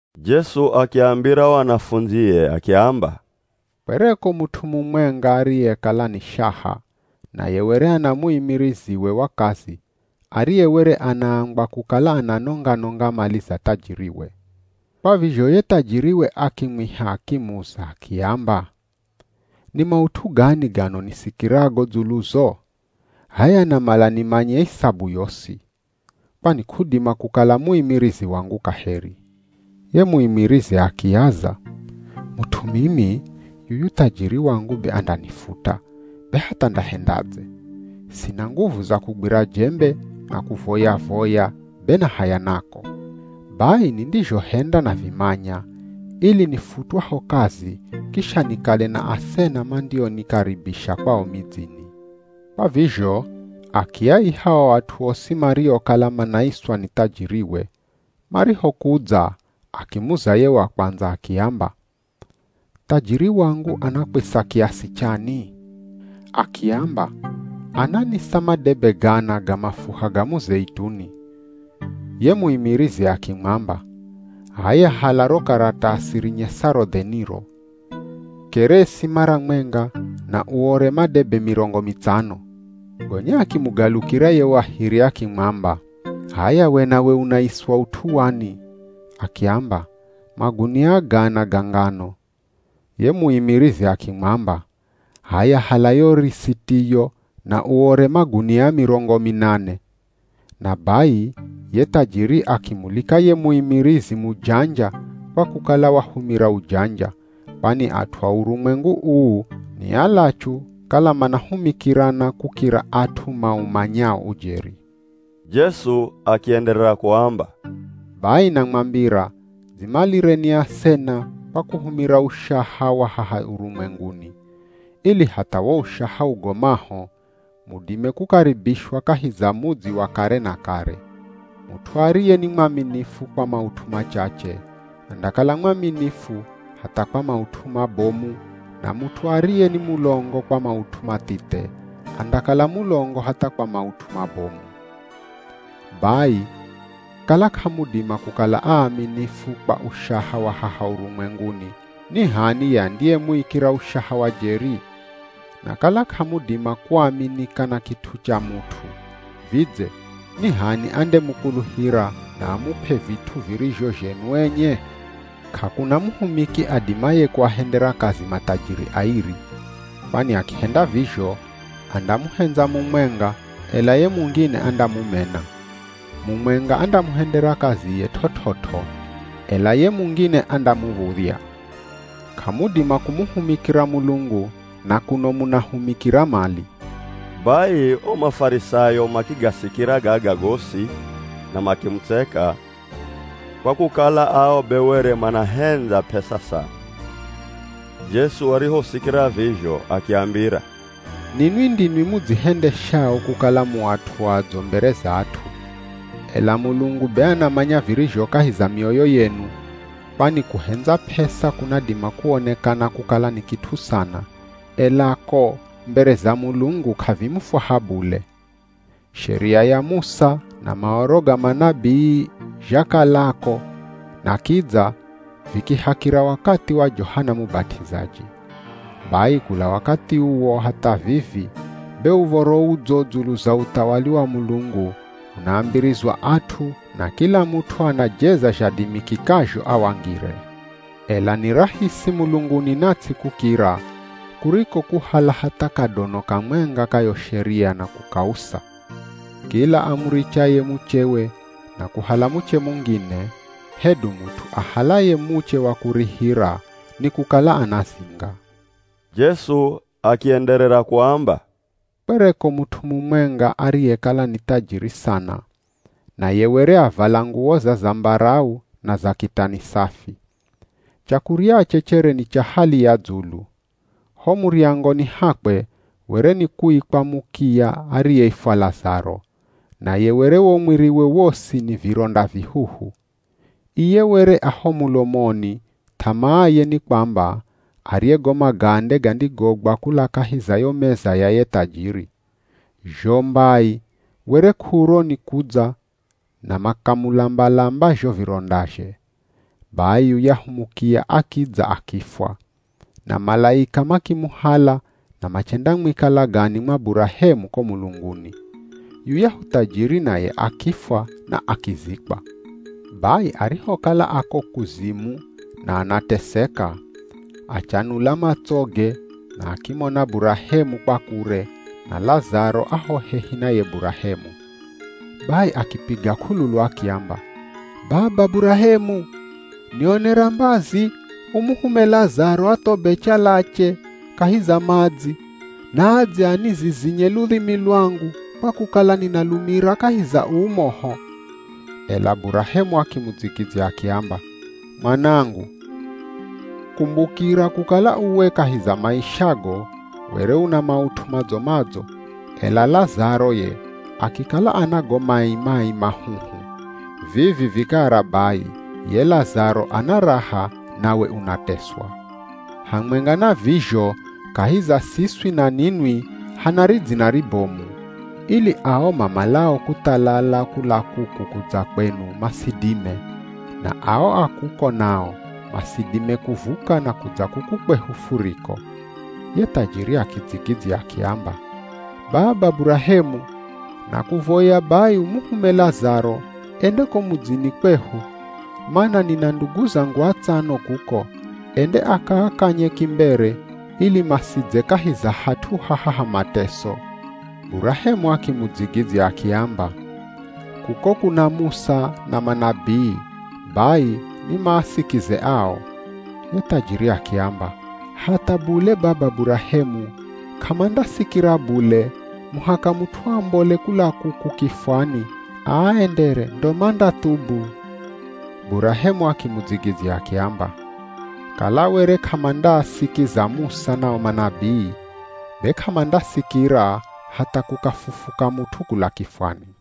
Jesu akiambira o anafundzie akiamba, “Kwereko mut'u mumwenga ariyekala ni shaha naye were ana muimiriziwe wa kazi ariye were anaambwa kukala ananonga-nonga mali za thajiriwe. Kwa vizho ye thajiriwe akimwiha akimuza akiamba, ‘Ni maut'u gani gano nisikirago dzuluzo? H'aya namala nimanye isabu yosi, kwani k'udima kukala muimirizi wangu kaheri.’ Ye muimirizi akiaza, ‘Mut'u mimi, yuyu thajiri wangu be andanifuta, be hatha ndahendadze? Sina nguvu za kugwira jembe, na kuvoya-voya be na haya nako. Bai nindizhohenda navimanya, ili nifutwaho kazi kisha nikale na asena mandionikaribisha kwao midzini.’ Kwa vizho akiaiha o at'u osi mariokala manaiswa ni thajiriwe. Marihokudza akimuza ye wa kwandza akiamba, ‘Thajiri wangu anakwisa kiasi chani?’ Akiamba, ‘Ananisa madebe gana ga mafuha ga muzeituni.’ Ye muimirizi akimwamba, ‘H'aya hala ro karatasi rinyesaro dheniro. Keresi mara mwenga na uore madebe mirongo mitsano.’ Gonya akimugalukira ye wa hiri akimwamba, ‘H'aya we nawe unaiswa ut'u wani?’ Akiamba, ‘Magunia gana ga ngano.’ Ye muimirizi akimwamba, ‘H'aya hala yo risitiyo na uore magunia mirongo minane.’ Na bai ye thajiri akimulika ye muimirizi mujanja kwa kukala wahumira ujanja, kwani at'u a urumwengu uu ni alachu kala manahumikirana kukira at'u maumanyao ujeri.” Jesu akienderera kuamba, “Bai namwambira dzimalireni asena kwa kuhumira ushaha wa haha urumwenguni, ili hatha wo ushaha ugomaho, mudime kukaribishwa kahi za mudzi wa kare na kare. Mut'u ariye ni mwaminifu kwa maut'u machache, andakala mwaminifu hatha kwa maut'u mabomu na mut'u ariye ni mulongo kwa maut'u mathithe andakala mulongo hatha kwa maut'u mabomu. Bai kala k'amudima kukala aaminifu kwa ushaha wa haha urumwenguni ni h'ani ye andiyemuikira ushaha wa jeri? Na kala k'amudima kuaminika na kit'u cha mut'u, vidze ni h'ani andemukuluhira na amup'e vit'u virizho zhenu enye? K'akuna muhumiki adimaye kuahendera kazi mathajiri airi. Kwani akihenda vizho, andamuhendza mumwenga ela ye mungine andamumena. Mumwenga andamuhendera kaziye t'ot'ot'o, ela ye mungine andamuv̱udhya. K'amudima kumuhumikira Mulungu na kuno munahumikira mali.” Bai o Mafarisayo makigasikira gaga gosi na makimutseka, kwa kukala ao be were manahendza p'esa sana. Jesu arihosikira vizho akiambira, “Ninwi ndinwi mudzihendeshao kukala mu at'u adzo mbere za at'u, ela Mulungu be anamanya virizho kahi za mioyo yenu, kwani kuhendza p'esa kunadima kuonekana kukala ni kit'u sana, ela ko mbere za Mulungu k'avimufwaha bule. “Sheria ya Musa na Maoro ga manabii zhakalako na kidza vikihakira wakathi wa Johana Mubat'izaji. Bai kula wakathi uwo hatha vivi be Uv̱oro Udzo dzulu za uthawali wa Mulungu unaambirizwa at'u na kila mut'u anajeza zhadimikikazho awangire. Ela ni rahisi mulunguni na ts'i kukira, kuriko kuhala hatha kadono kamwenga ka yo Sheria na kukausa. “Kila amurichaye muchewe na kuhala muche mungine, hedu mut'u ahalaye muche wa kurihira, nikukala anazinga.” Jesu akienderera kuamba, “Kwereko mut'u mumwenga ariyekala ni thajiri sana naye were avala nguwo za zambarau na za kitani safi. Chakuryache chere ni cha hali ya dzulu. Ho muryangoni hakwe were ni kuikwa mukiya ariyeifwa Lazaro, naye were wo mwiriwe wosi ni vironda vihuhu. Iye were a ho mulomoni th'amaaye ni kwamba arye go magande gandigogwa kula kahi za yo meza ya ye thajiri. Zho mbai were k'uro ni kudza na makamulamba-lamba zho virondazhe. Bai yuyahu mukiya akidza akifwa, na malaika makimuhala na machendamwika lagani mwa Burahemu ko mulunguni. Yuyahu thajiri naye akifwa na akizikwa. Bai arihokala ako kuzimu na anateseka, achanula matsoge na akimona Burahemu kwa kure, na Lazaro a ho hehi na ye Burahemu. Bai akipiga k'ululu akiamba, ‘Baba Burahemu, nionera mbazi umuhume Lazaro athobe chalache kahi za madzi naadze anizizinye ludhimi lwangu kwa kukala ninalumira kahi za uu moho.’ Ela Burahemu akimudzigidzya akiamba, ‘Mwanangu, kumbukira kukala uwe kahi za maishago were una maut'u madzo-madzo, ela Lazaro ye akikala ana go mai-mai mahuhu, vivi vikara bai ye Lazaro ana raha nawe unateswa. Hamwenga na vizho kahi za siswi na ninwi hana ridzina ribomu, ili ao mamalao kuthalala kula kuku kudza kwenu masidime, na ao a kuko nao masidime kuvuka na kudza kuku kwehu furiko.’ Ye thajiri akidzigidzya akiamba, ‘Baba Burahemu nakuvoya bai umuhume Lazaro ende ko mudzini kwehu mana nina ndugu zangu atsano kuko, ende akaakanye kimbere ili masidze kahi za hat'u haha ha mateso.’ Burahemu akimudzigidzya akiamba, ‘Kuko kuna Musa na manabii, bai ni maasikize ao.’ Ye thajiri akiamba, ‘Hatha bule Baba Burahemu k'amandasikira bule muhaka mut'u ambole kula kuku kifwani aaendere ndo mandathubu.’ Burahemu akimudzigidzya akiamba, ‘Kala were k'amandaasikiza Musa na o manabii, be k'amandasikira hatha kukafufuka mut'u kula kifwani.’”